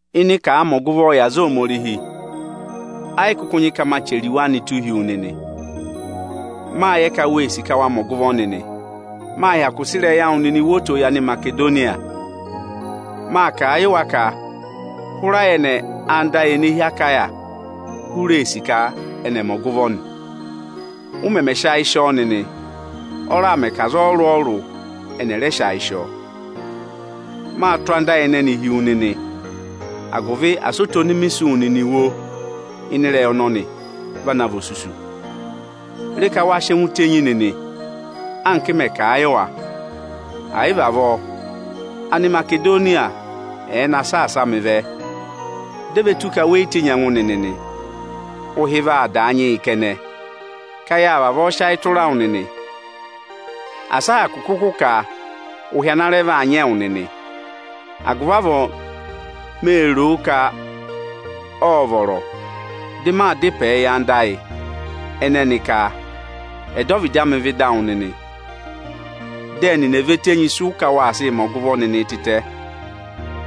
Ịnị ka àa mẹ ọgụvọọ yị aza Ohomorihi, ẹ yị kụkụ nyị ka maa chẹrẹ iwe anịị tụ́ụ hi wu nịnị. Mâ yẹ ka wee sì ka wa mẹ ọgụvọ nịnị. Mâ hyakụ sị ịrẹyị awụ nịnị wo oto yị Animasedoniya. Mâ kà a yị wa ka hụrẹ ayẹnẹ ánda ayị ene hi Akaya hụrẹ ee sì ka ẹnị ẹ̀ mẹ ọgụvọ nị. Ụ mẹmẹ sị ayị sị ọọ nịnị, ọ raà mẹ ka aza ọrụrụ-ọrụrụ ẹnị ẹ̀ rẹ sị ayị sị ọọ. Maa tụ́ anda ayị ẹnẹnịị hi wu nịnị, agụvị asị oto ọnị mị sị wụ nịnị wo ịnị ịrẹyị ọnọnị, va na vị osusu. Re ka wa sị ẹngụ tenyi nịnị, anka m mẹ̀ kà a yị wa. È yị vị avọọ, Animasedoniya ẹ̀ẹ na saasa mị vẹ, dị e ve tù ka we yi tenyi ẹngụ nịnị nị, ụhị vaa daa nyị yị kẹnẹ ka yâ vavọọ sị ayị tụra wụ nịnị. Asị a hyakụ kụkụ kà ụhị ana rẹ vaa nyị ẹwụ nịnị. Agụvị avọọ mee roo ka ộ vọrọ, dị mị dá ịpẹ yị anda ayị ẹnẹnị ka ẹ̀ dọ ọvịdị amị vẹ ịdị awụ nịnị, dị ẹnịnị è ve tenyi ịsị ụ ka waa sịị mẹ ọgụvọ nịnị tịtẹ.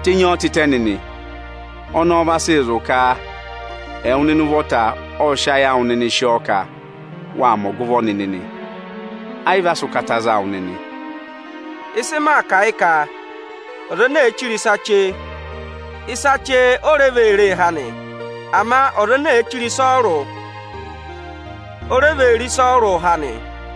Tenyi ọọ tịtẹ nịnị! Ọnọọ vaa sị zụ̀ ka ẹwụ nịnị ụvọta ọ sị ayị awụ nịnị sị ọọ ka waa mẹ ọgụvọ nịnị nị, ẹ yị vị a sị ụkata za wụ nịnị. Ịsị maa kà yị ka: ọza ene èe chire ịsa chee, ịsa chee o re vee ree há nị; ama ọza ene èe chire ịsa ọrụrụ, o re vee re ịsa ọrụrụ há nị.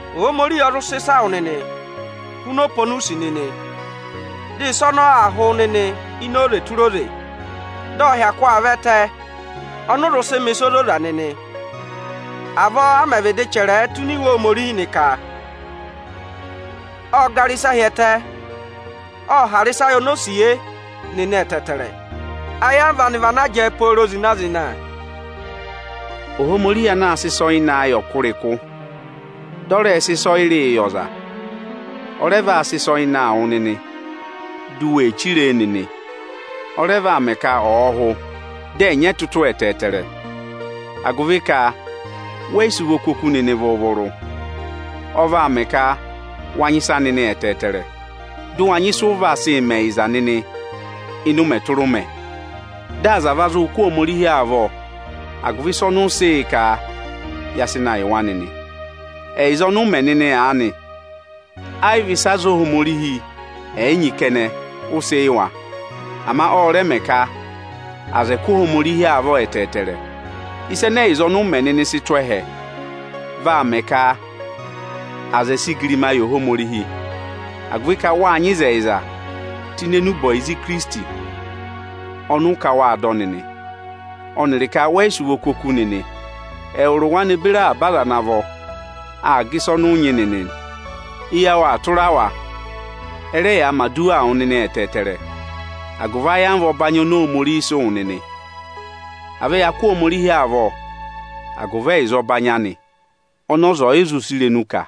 Ohomorihi ọ zụ sị ịsa wụ nịnị huna ọpa oni u sì nịnị. Dị ịsa ọnọọ aa hụ wụ nịnị ini oze tụra oze, dị ọ hyakụ aa vọ ẹtẹ ọnị ụ zụ sị mẹ̀ ịsa ozoza nịnị. Avọọ a mẹ̀ vịdị chẹrẹẹ tụ́ ini Iwe Ohomorihi nị, ka, “Ộ gara ịsa hi ẹtẹ, ộ hara ịsa yị onosiye nịnị ẹtẹẹtẹrẹ, ayamva anị vị ana jẹẹ pooro zịna-zịna.” Ohomorihi anaā sịị ịsa ọyịnaa yị ọkụrịkụ, dị ọ rẹẹ̄ sị ịsọyịrịị yị ọza, ọ rẹ vaa sị ịsa ọyịnaa wụ nịnị, di u we chire e nịnị. Ọ rẹ vaa mẹ ka ọ̀ hụ, dị ẹ̀ nyị ẹtụtụ ẹtẹẹtẹrẹ, agụvị ka wẹ yị sị ụvọ kú oku nịnị vụrụ-vụrụ. Ọ vaa mẹ ka wa nyị ịsa nịnị ẹtẹẹtẹrẹ, dị ụ wa nyị ịsụ ụ vaa sị mẹ ẹyịza nịnị ịnị ụmẹ tụra ụmẹ. Dị aza ẹ̀ va zụụ kụ́ Ohomorihi avọ agụvị ịsa ọnị ụ sị yị ka ya sị na yị wa nịnị. Ẹyịza ọnị ụ mẹ nịnị aanị, ẹ yị vị ịsị aza Ohomorihi ẹ̀ yị nyị kẹnẹ ụ sị yị wa. Ama ọ rẹ vaa mẹ ka aza ẹ̀ẹ kụ́ Ohomorihi avọ ẹtẹẹtẹrẹ. Ịsa ẹnẹ ẹyịza ọnị ụ mẹ nịnị sị tụ́ ẹhẹ, vaa mẹ ka aza ẹ̀ẹ sị igirimaa yị Ohomorihi, agụvị ka wáa nyị ịzẹyịza tụ́ ini enube ọyịza Ikirisiti ọnị ụ ka wâ dọ nịnị, ọnịrị ka wẹ yị sị ụvọ kú oku nịnị, ẹwụrị wa ne beri avaba aza ana vọ aa gà ịsa ọnị ụ nyị nịnị. Eyi awụ aa tụra wa, ẹ rẹ yaa mẹ̀ aduwaa wụ nịnị ẹtẹẹtẹrẹ agụvị ayamva ọbanyị oni Ohomorihi sị wụ nịnị. À vẹ ya kụ́ Ohomorihi avọ agụvị ẹyịza ọbanyị anị ọnị ọza ọ̀ yị zụ sị irenu kà!